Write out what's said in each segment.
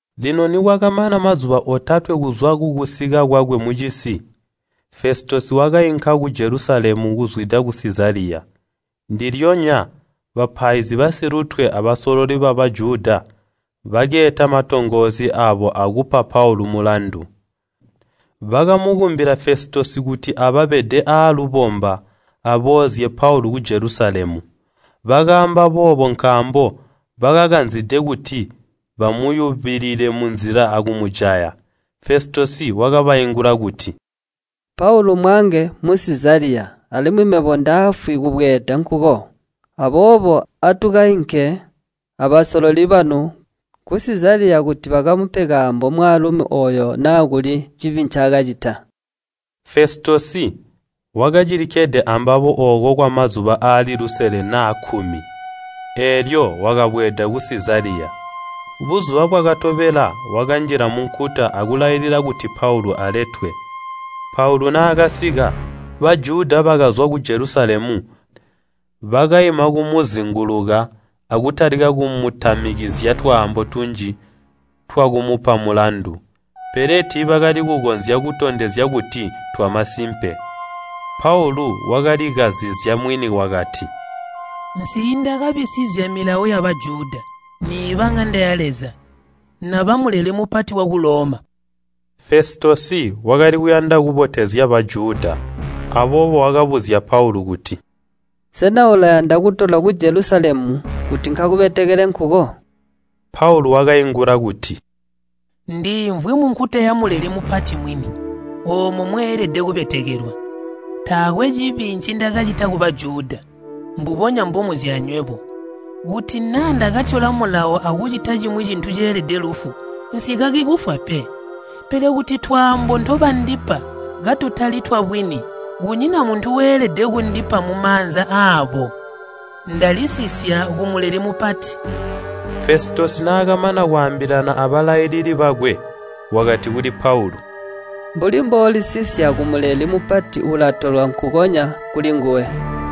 Lino nikwakamana mazuba otatwe kuzwa kukusika kwakwe mucisi, Fesitosi wakainka ku Jelusalemu kuzwida ku Sizaliya. Ndilyonya bapaizi basilutwe abasololi ba Bajuda bakeeta matongoosi aabo aakupa Paulu mulandu. Bakamukumbila Fesitosi kuti ababede aalubomba, aboozye Paulu ku Jelusalemu. Bakaamba boobo nkaambo bakakanzide kuti bamuyubilile munzila akumujaya. Fesitosi wakabaingula kuti, “Paulu mmwaange mu Sizaliya, alimwi mebo ndaafwi kubweeda nkuko. Aboobo atukainke abasololi banu ku Sizaliya kuti bakamupe kaambo mwaalumi ooyo naa kuli cibi ncaakacita.” Fesitosi wakacilikkede ambabo ooko kwamazuba aali lusele naa kkumi, eelyo wakabweeda ku Sizaliya. Buzuba bwakatobela wakanjila munkuta akulailila kuti Paulu aletwe. Paulu naakasika, Bajuda bakazwa ku Jelusalemu, bakaima kumuzinguluka, akutalika kumutamikizya twaambo tunji twakumupa mulandu, pele tiibakali kukonzya kutondezya kuti ntwamasimpe. Paulu wakalikazizya mwini wakati, “Nsiindakabisizya Milawo ya Bajuda, niiba ŋanda ya Leza, naba Muleli Mupati waku Loma.” Fesitosi wakali kuyanda kubotezya Bajuda, aboobo wakabuzya Paulu kuti, “Sena ulayanda kutolwa ku Jelusalemu kuti nkakubetekele nkuko?” Paulu wakaingula kuti, “Ndiimvwi munkuta ya Muleli Mupati mwini, oomo mweelede kubetekelwa. Taakwe cibi ncindakacita ku Bajuda, mbubonya mbomuzi anywebo. Kuti naa ndakatyola mulawo akucita cimwi cintu ceelede lufu, nsikaki kufwa pe. Pele kuti twaambo ntobandipa katutali twabwini, kunyina muntu weelede kundipa mumaanza aabo. Ndalisisya ku Muleli Mupati.” Fesitosi naakamana kwaambilana abalailili bakwe, wakati kuli Paulu, “Mbuli mboolisisya ku Muleli Mupati ulatolwa nkukonya kulinguwe.”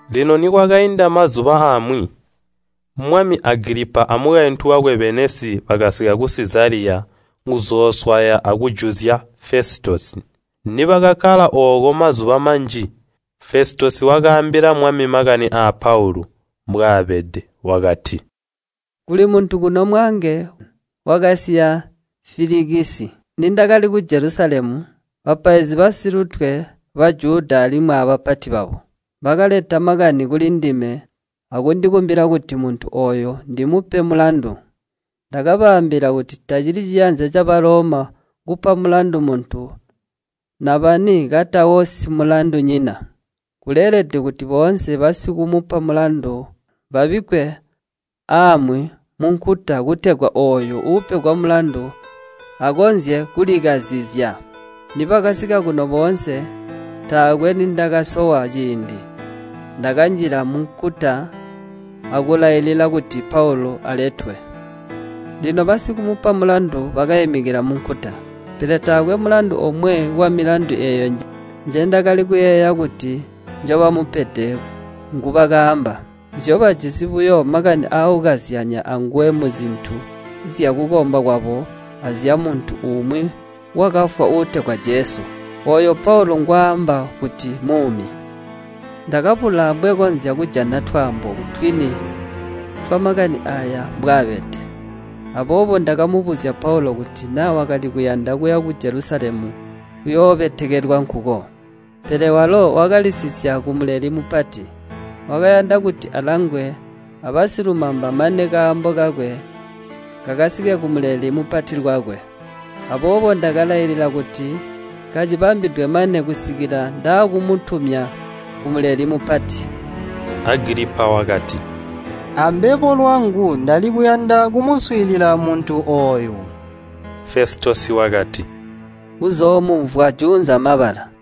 Lino nikwakainda mazuba amwi, mwami Agilipa a mukaintu wakwe Beenisi bakasika ku Sizaliya kuzooswaya akujuzya Fesitosi. Nibakakkala ooko mazuba manji, Fesitosi wakaambila mwami makani aa Paulu mbwaabede. Wakati, “Kuli muntu kuno mwaange wakasiya Filikisi. Nindakali ku Jelusalemu, bapaizi basilutwe ba Bajuda alimwi abapati babo, bakaleta makani kulindime akundikumbila kuti muntu ooyu ndimupe mulandu. Ndakabaambila kuti tacili ciyanza ca Baloma kupa mulandu muntu nabani katawo simulandunyina. Kuleelede kuti boonse basikumupa mulandu babikkwe aamwi munkuta kutegwa ooyu uupegwa mulandu akonzye kulikazizya. Nibakasika kuno boonse, taakwe nindakasowa ciindi, ndakanjila munkuta akulailila kuti Paulu aletwe. Lino basikumupa mulandu bakaimikila munkuta, pele taakwe mulandu omwe wamilandu eeyo njendakali kuyeeya kuti njobamupede ngubakaamba. Nzyobajisi buyo makani aakukazyanya anguwe muzintu zyakukomba kwabo azyamuntu umwi wakafwa uutegwa Jesu, ooyo Paulu ngwaamba kuti mmuumi. Ndakabula ambwekonzya kujana twaambo twini twamakani aaya mbwaabede, aboobo ndakabuzya Paulu kuti naa wakali kuyanda kuya ku Jelusalemu akuyoobetekelwa nkuko. Pele walo wakalisisya ku Muleli Mupati, wakayanda kuti alangwe abasilumamba mane kaambo kakwe kakasike ku Muleli Mupati lwakwe. Aboobo ndakalailila kuti kacibambidwe mane kusikila ndaakumutumya ku Muleli Mupati.” Agilipa wakati, “Ambebo lwangu ndali kuyanda kumuswiilila muntu ooyo.” Fesitosi wakati, “Uzoomumvwa juunza mabala.”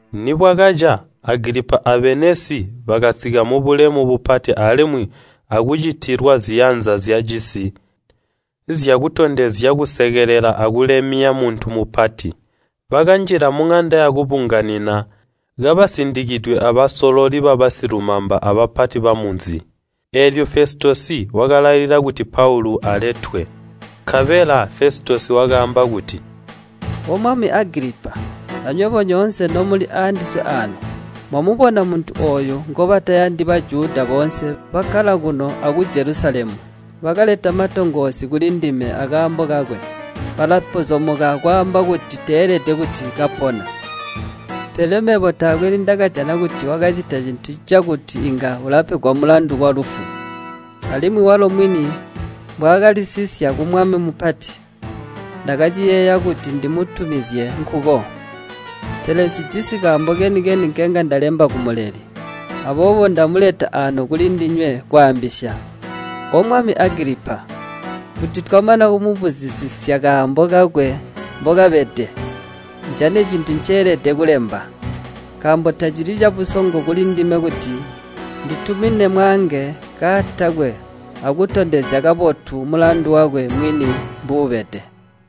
Nibwakaca Agilipa a Beenisi bakasika mubulemu bupati alimwi akucitilwa ziyanza zyacisi zyakutondezya kusekelela akulemya muntu mupati. Bakanjila muŋanda yakubunganina kabasindikidwe abasololi babasilumamba abapati bamunzi. Eelyo Fesitosi wakalailila kuti Paulu aletwe. Nkabela Festitosi wakaamba kuti, “O Mwami Agilipa, anywebo nyoonse nomuli aandiswe aano. Mwamubona muntu ooyu ngobatayandi Bajuda boonse bakkala kuno aku Jelusalemu. Bakaleta matongoosi kulindime akaambo kakwe. Balapozomoka akwaamba kuti teelede kuti kapona. Pele mebo taakwe nindakajana kuti wakacita cintu cakuti inga ulapegwa mulandu walufu. Alimwi walo mwini mbwaakalisisya kumwami mupati, ndakaciyeeya kuti ndimutumizye nkuko. Pele nsijisi kaambo keni-keni nkenga ndalemba kumuleli. Aboobo ndamuleta aano kulindinywe kwaambisya, O Mwami Agilipa! Kuti twamana kumubuzisisya kaambo kakwe mbokabede, ndijane cintu ncendeelede kulemba. Nkaambo tacili cabusongo kulindime kuti nditumine mwaange kaatakwe akutondezya kabotu mulandu wakwe mwini mbuubede.”